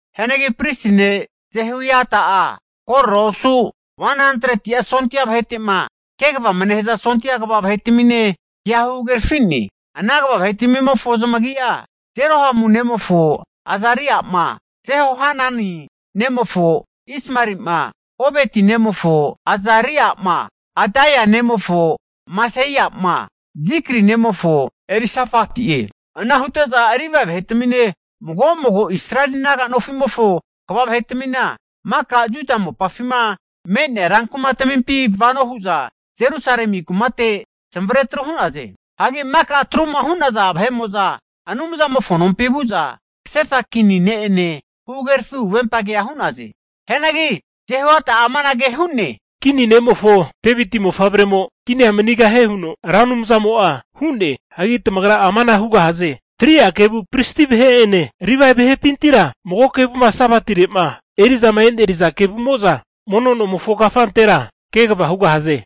Hianagi pristi ne' Jehoiada'a korora osu 100'a sondia vahete'ma kegavama nehaza sondia kva vahetamine kea huhagerafi'ne. Ana kva vahetmimofo zamagi'a, Jerohamu nemofo Azaria'ma, Jehohanani nemofo Ismaeli'ma, Obeti nemofo Azaria'ma, Adaia nemofo Maseia'ma, Zikri nemofo Elisafati'e. Ana hute'za Livae vahetamine, mago mago Israeli naga nofimofo kva vahetmina maka Juda mopafima me'nea rankumatmimpi vano hu'za zamavare'za Jerusalemi kumate zamavare atru hu'naze. Hagi maka atruma hu'naza vahe'mo'za Anumzamofo nompi vu'za kasefa kini ne'ene huhagerafi huvempa kea hu'naze. Hagi Jehoiada'a amanage hu'ne, kini ne'mofo Deviti mofavremo kinia manigahie huno Ra Anumzamo'a hu'ne. Hagi tamagra amana hugahaze, 3'a kevu pristi vahe'ene Livae vahepintira, mago kevuma Sabatire'ma eri'zama eneriza kevumo'za mono nomofo kafantera kegava hugahaze.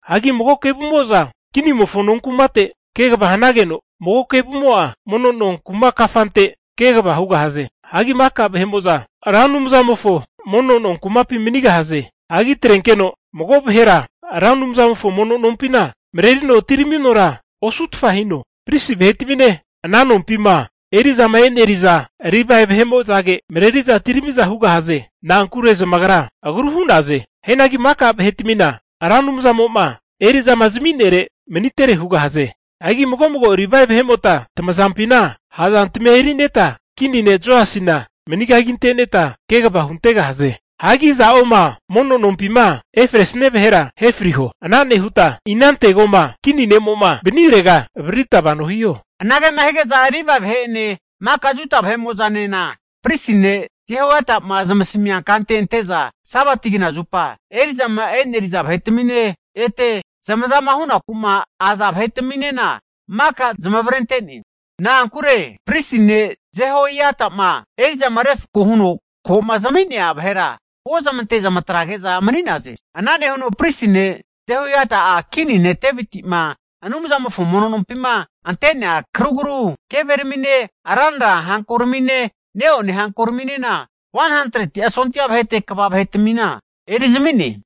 Hagi mago kevumo'za kini ne'mofo nonkumate kegava hanageno, mago kevumo'a mono nonkuma kafante kegava hugahaze. Hagi maka vahe'mo'za Ra Anumzamofo mono no kumapi manigahaze. Hagi atrenkeno mago vahe'mo'a Ra Anumzamofo mono nompina marerino atiraminora osutfa hino. Pristi vahetamine ana nompima eri'zama eri'naza Livae vahe'mo'zage mareri'za atiramiza hugahaze. Na'ankure zamagra agru hu'naze. Hianagi maka vahetmina Ra Anumzamo'ma eri'zama zami'nere manitere hugahaze. Hagi mago mago Livae vahemota tamazampina ha'zantmia erineta kini ne' Joasina manigaginteneta kegava huntegahaze. Hagi iza'oma mono nompima efresia vahera ahefriho. Ana nehuta inantegoma kini ne'mo'ma vanirega avaririta vano hiho. Anage hige'za Livae vahe'ene maka Juda vahe'mo'zanena pristi ne' Jehoiada'ma zamasamia kante ante'za Sabati knazupa eri'zama e'neri'za vahetamine ete zamazama hunaku'ma aza vahetaminena, maka zamavarente'ne. Na'ankure pristi ne' Jehoiadama eri'zama refkoma huno koma zami'nea vahera huozmante zamatrege'za mani'naze. Ana nehuno pristi ne' Jehoiada'a kini ne' Deviti'ma Anumzamofo mono nompima ante'nea karugru keveramine, ranra hankoramine, neone hankoraminena 100'a sondia vahete kva vahetamina erizmi'ne.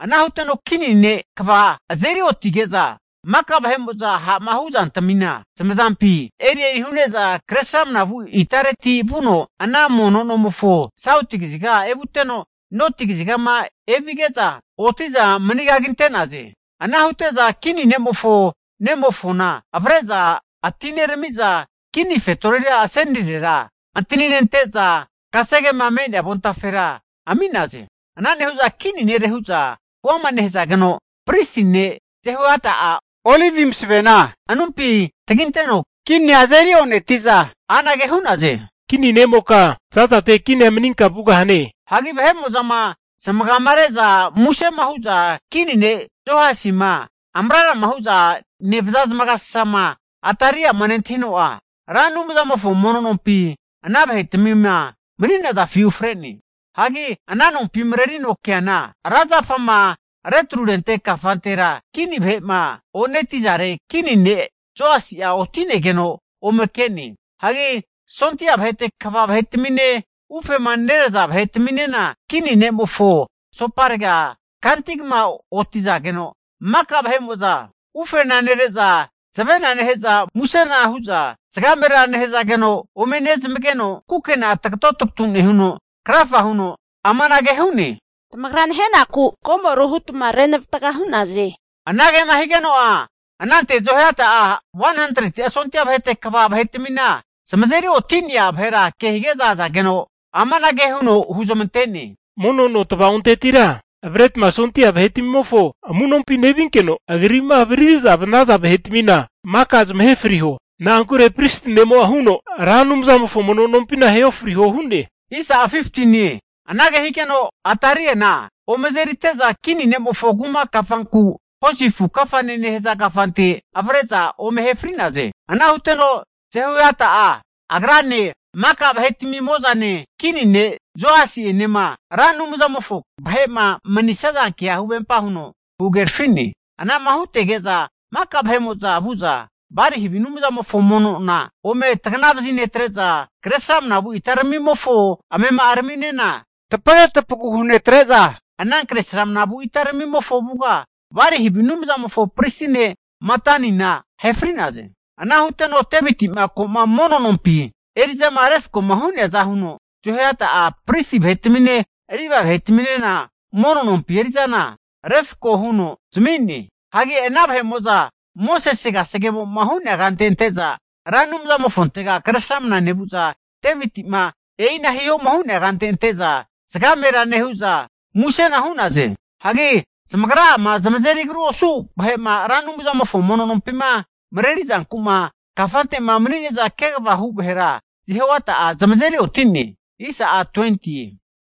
Ana huteno kini ne'mo'a kva vahera zamazeri otige'za maka ha'ma huzantamina zamazampina erieri hu'neza kre sramnavu itareti vuno, ana mono nomofo sauti kaziga evuteno, noti kazigama evige'za oti'za manigaginte'naze. Ana hute'za kini ne'mofo nemofona avre'za atineramiza kini fetorira asenirera antaninente'za kasegema me'nea avontafera ami'naze. Ana nehu'za kini nere hu'za huama nehazageno, pristi ne' Johoiada'a olivi masavena anumpi taginte'no kinia azeri oneti'za anage hu'naze, Kini ne'moka zazate kinia maninka vugahane. Hagi vahe'mo'zama zamagamare'za musema hu'za kini ne' Joasima amrarama hu'za nevaza zamagasasama Atalia'ma nentahino'a, Ra Anumzamofo mono nompi ana vahetmima mani'nazafi ufre'ne. Hagi ana nompima marerino keana, ra zafama retrurente kafantera kini vahe'ma oneti'zare kini ne' Joasi'a oti'negeno ome ke'ne. Hagi sondia vahete kva vahetamine, ufema neraza vahetaminena kini ne'mofo asoparega kantigma otizageno maka vahe'mo'za ufena nere'za, zavena nehe'za musena hu'za zagamera nehazageno ome nezamageno, kukena'a tagato nehuno krafa huno amanage hu'ne, tamagra nahenaku komoru hutma renavatga hu'naze. Anagema higeno'a, anante Jehoiada'a 100'a sondia vahete kva vahetmima zamazeri oti'nea vahera ke hige'za azageno amanage huno huzmante'ne, Mono no tava'ontetira avretma sondia vahetmimofo amunompi nevinkeno agri'ma avariri'zama vanaza vahetmina maka zamahe friho. Na'ankure pristi ne'mo'a huno Ra Anumzamofo mono nompina ahe ofriho hu'ne. Anage higeno Ataliana ome azerite'za kini ne'mofo kuma kafanku Hosi afu kafane nehaza kafante avre'za ome ahe fri'naze. Ana huteno Jehoiada'a agrane, maka vahetami'mozane, kini ne' Joasi'enema Ra Anumzamofo vahe'ma manisaza kea huvempa huno huhagerafi'ne. Ana'ma hutege'za maka vahe'mo'za vu'za Bali havi anumzamofo mono nona ome taganavazi netre'za, kre sramnavu itaramimofo, amema'araminena tapage tapagu hunetre'za, ana kre sramnavu itaramimofo avuga, Bali havi anumzamofo pristi ne' Matanina ahe fri'naze. Ana huteno Deviti'ma ko'ma mono nompi eri'zama refkoma hu'neaza huno Jehoiada'a pristi vahetamine, Livae vahetaminena mono nompi eri'zana refko huno zami'ne. Hagi ana vahe'mo'za Mosese kasegemo'ma hu'nea kante ante'za Ra Anumzamofontega kresramna nevu'za Deviti'ma e'ina hihoma hu'nea kante ante'za zagamera nehu'za musena hu'naze. Hagi zamagra'ama zamazeri agru osu vahe'ma Ra Anumzamofo mono nompima marerizanku'ma kafante'ma mani'ne'za kegava hu vahera Jehoiada'a zamazeri oti'ne.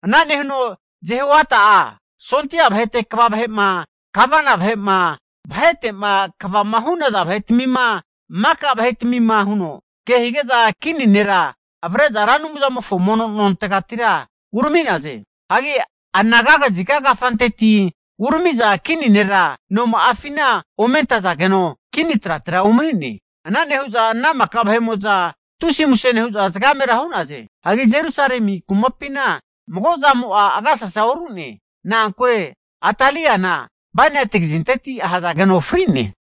Ana nehuno Jehoiada'a sondia vahete kva vahe'ma, gavana vahe'ma, vahete'ma kvama hu'naza vahetmima, maka vahetmima huno kehige'za kini nera avre'za Ra Anumzamofo mono nontegatira urami'naze. Hagi anaga kaziga kafanteti umareri'za kini nera noma'afina ome antazageno kini trate umani'ne. Ana nehu'za ana maka vahe'mo'za tusi muse nehu'za, zagamera hu'naze. Hagi Jerusalemi kumapina mago zamo'a agasasa oru'ne, na'ankure Ataliana bainati kazinteti ahazageno fri'ne.